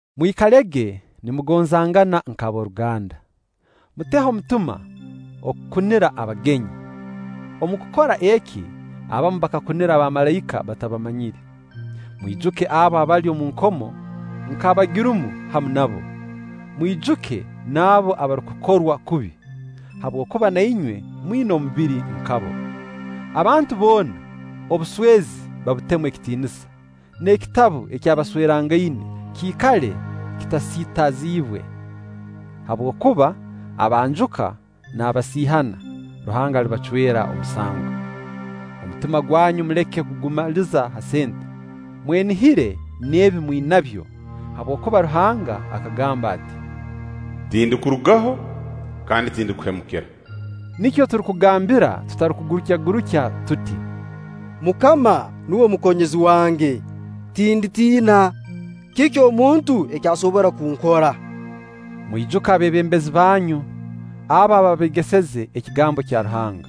Mwikalege nimugonzangana nk'ab'oruganda. Muteho omutima okukunira abagenyi. Omu kukora eki, abamu bakakunira abamalaika batabamanyire. Mwijuke abo abali omu nkomo, nk'abagirumu hamu nabo. Mwijuke n'abo abarukukorwa kubi, habwokuba na inywe mwina omubiri nka bo. Abantu boona obuswezi babutemu ekitiinisa, n'ekitabu ky'abaswerangaine kiikale kitasiitaziibwe; habwokuba abanjuka n'abasiihana, Ruhanga alibacwera omusango. Omutima gwanyu muleke kugumaliza ha sente. Mwenihire n'ebi mwinabyo, habwokuba Ruhanga akagamba ati: “Tindikurugaho kandi tindikuhemukira.” Nikyo turukugambira tutarukugurukyagurukya tuti: “MUKAMA nuwe mukonyezi wange, tinditiina; kiki omuntu eki asobora kunkora?” Mwijuke abeebembezi banyu, abo abaabeegeseze ekigambo kya Ruhanga;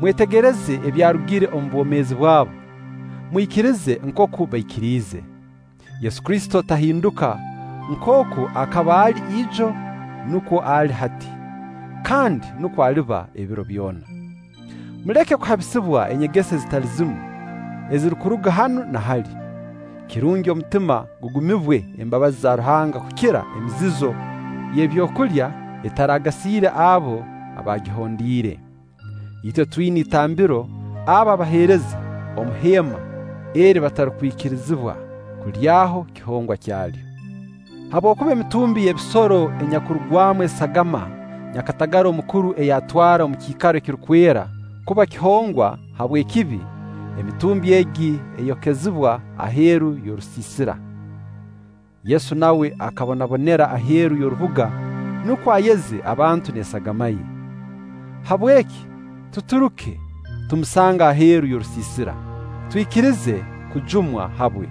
mwetegereze ebyarugire omu bwomeezi bwabo, mwikirize nkooku baikiriize. Yesu Kristo tahinduka nkooku akaba ali ijo, nukwo ali hati, kandi nukwo aliba ebiro byona. Muleke kuhabisibwa enyegesa ezitali zimu ezirukuruga hanu na hali; kirungi omutima gugumibwe embabazi za Ruhanga kukira emizizo y'ebyokulya etaragasiire abo abaagihondiire. Itwe twina itambiro abo abaheereza omu heema eri batarukwikirizibwa kulyaho kihongwa kyalyo. Habwokuba emitumbi ey'ebisoro enyakurugwamu esagama nyakatagara omukuru ei atwara omu kiikaro ekirukwera kuba kihongwa habw'ekibi, emitumbi egi eyokezibwa aheeru y'orusiisira. Yesu nawe akabonabonera aheeru y'orubuga, nukwo ayeze abantu n'esagama ye. Habweki tuturuke, tumusange aheeru y'orusiisira, twikirize kujumwa habwe.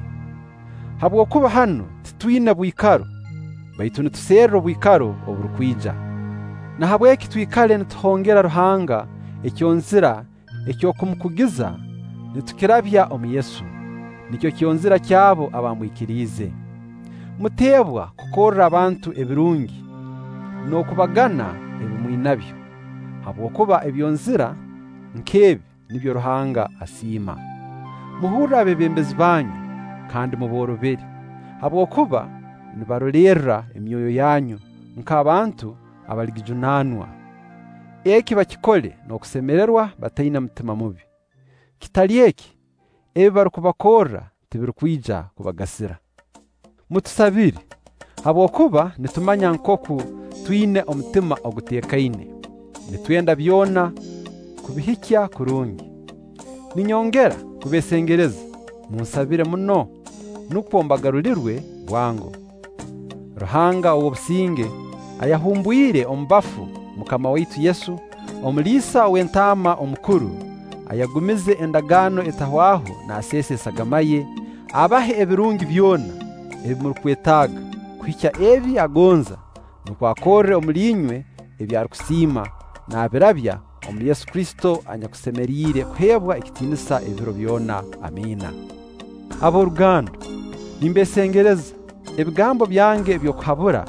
Habwokuba hanu titwina bwikaro, baitu nituserra obwikaro oburukwija. Nahabweki twikale nituhongera Ruhanga ekyonzira eky'okumukugiza nitukirabya omu Yesu, nikyo kyonzira ky'abo abamwikiriize. Mutebwa kukorra abantu ebirungi n'okubagana ebi mwinabyo, habwokuba ebyonzira nk'ebi nibyo Ruhanga asiima. Muhurre abeebembezi banyu kandi muboorobere; habwokuba nibarolerra emyoyo yanyu nk'abantu abaligijunaanwa. Eki bakikole n'okusemererwa bataina mutima mubi; kitali eki, ebi barukubakorra tibirukwija kubagasira. Mutusabire, habwokuba nitumanya nkooku twina omutima oguteekaine. Nitwenda byona kubihikya kurungi. Ninyongera kubeesengereza: munsabire muno, nukwo mbagarulirwe bwango. Ruhanga ow'obusinge, ayahumbwire omu bafu MUKAMA waitu Yesu, omuliisa ow'entaama omukuru, ayagumize endagaano etahwaho naaseesa esagama ye, abahe ebirungi byona ebi murukwetaaga kuhikya ebi agonza, nukwo akorre omuli inywe ebi arukusiima, naabirabya omu Yesu Kristo anyakusemeriire kuheebwa ekitiinisa ebiro byona. Amiina. Ab'oruganda, nimbeesengereza, ebigambo byange eby'okubahabura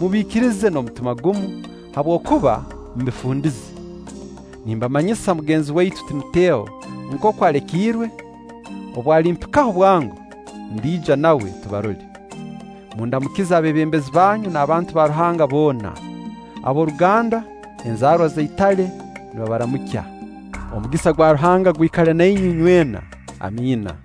mubiikirize n'omutima gumu, habwokuba mbifundize. Nimbamanyisa mugenzi waitu Timoteho nkooku alekiirwe. Obu alimpikaho bwango, ndija nawe tubarole. Mundamukize abeebembezi banyu n'abantu ba Ruhanga boona. Ab'oruganda, enzaarwa za Itale nibabaramukwa. Omugisa gwa Ruhanga gwikale na inywe inywena. Amina.